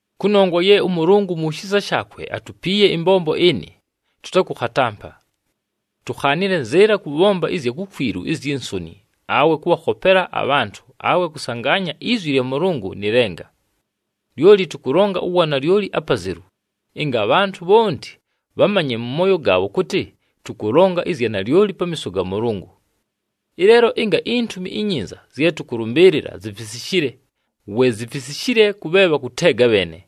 Kʉnongwa ye ʉMʉlʉngʉ mu shisa shaakwe atupiiye ɨmbombo ɨnɨ, tʉtakʉkhatampa. Tukhaanile nzɨɨla kʉbhomba ɨzya kukwilu izyi nsoni, awe kʉbhakhopela abhantʉ, awe kʉsangaanya izwi lya Mʉlʉngʉ nɨ lenga. Lyoli tʉkʉlonga uwanalyoli apazelu, ɨnga abhantʉ bhonti bhamanye mʉ mooyo gaabho kʉtɨ tʉkʉlonga ɨzya nalyoli pamiiso ga Mʉlʉngʉ. Ɨleelo ɨnga iNtumi iNyinza zye tʉkʉlʉmbɨɨlɨla zifisishile, we zifisishile kʉ bhe bhakʉteega bheene.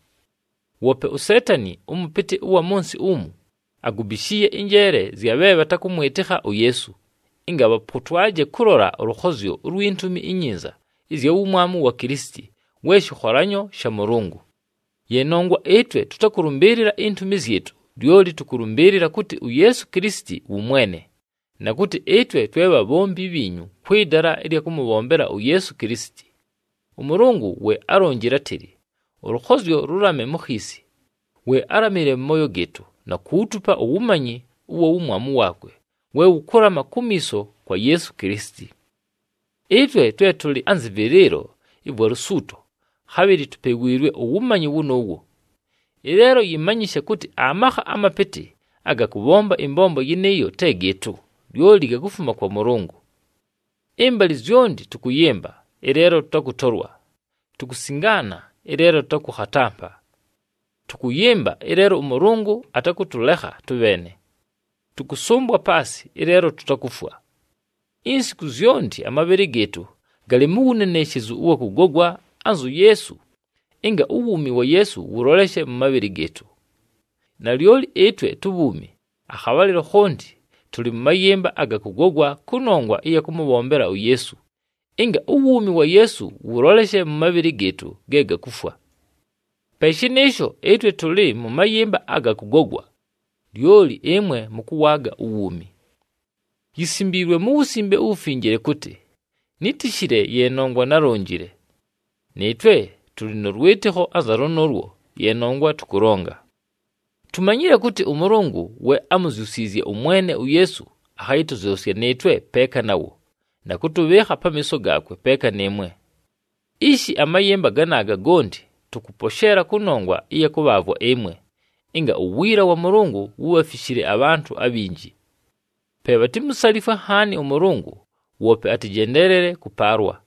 Woope uSeetani ʉmʉpɨtɨ ʉwa mʉ nsɨ umu, agubishiiye ɨnjeele zya bhe bhatakʉmwɨtɨkha uYeesu, ɨnga bhapotwaje kʉlola ʉlʉkhozyo ulwi Ntumi iNyinza ɨzya wumwamu wa Kilisiti we shɨkholanyo sha Mʉlʉngʉ. Ye nongwa ɨtwe tʉtakʉlʉmbɨɨlɨla intumi zyɨtʉ, lyoli tʉkʉlʉmbɨɨlɨla kʉtɨ uYeesu Kilisiti wʉ Mwene, na kʉtɨ ɨtwe twe bhabhombi bhiinyu kwɨ dala ɨlya kʉmʉbhombela uYeesu Kilisiti. ɄMʉlʉngʉ we álonjile átɨlɨ, “Ʉlʉkhozyo lʉlame mu khiisi,” we álamile mʉ mooyo gɨɨtʉ, na kuutupa uwumanyi ʉwa wumwamu waakwe we wʉkʉlama kumiiso kwa Yeesu Kilisiti. Ɨtwe twe tʉlɨ anzɨ vɨlɨɨlo ɨvwa lusuuto, khabhɨlɨ tupewiilwe uwumanyi wʉnʉʉwo. Ɨleelo yɨmanyɨshe kʉtɨ amakha amapɨtɨ aga kʉbhomba ɨmbombo yɨnɨɨyo te gɨɨtʉ, lyoli gakufuma kwa Mʉlʉngʉ. Ɨmbalɨ zyonti tʉkʉyɨmba, ɨleelo tʉtakʉtolwa, tukusingaana, ɨleelo tʉtakʉkhatampa. Tʉkʉyɨmba, ɨleelo ʉMʉlʉngʉ atakʉtʉlekha tʉbheene. Tʉkʉsʉmbwa paasɨ, ɨleelo tutakufwa. Insiku zyonti amabhɨlɨ gɨɨtʉ galɨ mu wuneneshezu ʉwa kʉgogwa anzu Yeesu, ɨnga uwuumi wa Yeesu wʉloleshe mʉ mabhɨlɨ gɨɨtʉ. Nalyoli ɨtwe tubhuumi, akhabhalɨlo khonti tʉlɨ mʉ mayɨmba aga kʉgogwa kʉnongwa ɨya kʉmʉbhombela uYeesu, ɨnga uwuumi wa Yeesu wʉloleshe mʉ mabhɨlɨ gɨɨtʉ ge gakufwa. Pe shɨnɨɨsho, ɨtwe tʉlɨ mʉ mayɨmba aga kʉgogwa, lyoli ɨmwe mʉkʉwaaga uwuumi. Yisimbiilwe mu Wusimbe uWufinjile kʉtɨ, “Nítishile ye nongwa nálonjile.” Nɨɨtwe tʉlɨ nʉ lwɨtɨkho anza lʉnʉʉlwo, ye nongwa tʉkʉlonga. Tumanyile kʉtɨ ʉMʉlʉngʉ we ámuzyusiizye ʉMwene uYeesu, akhayɨtʉzyʉsya nɨɨtwe peeka nawo, na kʉtʉbhɨɨkha pamiiso gaakwe peeka nɨɨmwe. Ishi, amayɨmba ganaaga gonti tʉkʉposheela kʉnongwa ɨya kʉbhaavwa ɨmwe, ɨnga uwiila wa Mʉlʉngʉ wubhafishile abhantʉ abhinji. Pe bhatimusalifwe nhaani ʉMʉlʉngʉ, woope atɨjendeelele kʉpaalwa.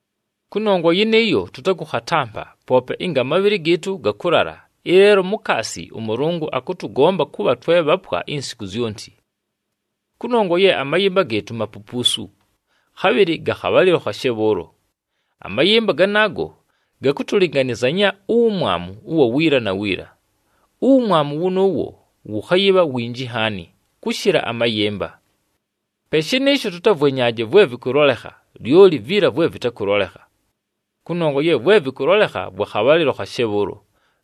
Kʉnongwa yɨnɨɨyo, tʉtakʉkhatampa, poope ɨnga amabhɨlɨ gɨɨtʉ gakʉlala, ɨleelo mukaasi ʉMʉlʉngʉ akʉtʉgomba kʉbha twe bhapwa insiku zyonti. Kʉnongwa ye amayɨmba gɨɨtʉ mapupuusu, khabhɨlɨ ga khabhalɨlo khashe bhʉʉlo. Amayɨmba ganaago, gakʉtʉlɨnganɨzanya uwumwamu ʉwa wiila na wiila. Uwumwamu wʉnʉʉwo wʉkhayɨbha winji nhaani, kʉshɨla amayɨmba. Pe shɨnɨɨsho, tʉtavwenyaaje vwe vɨkʉlolekha, lyoli viila vwe vɨtakʉlolekha. Kʉnongwa ye vwe vɨkʉlolekha vwa khabhalɨlo khashe bhʉʉlo,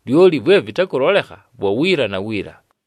lyoli vwe vɨtakʉlolekha vwa wiila na wiila.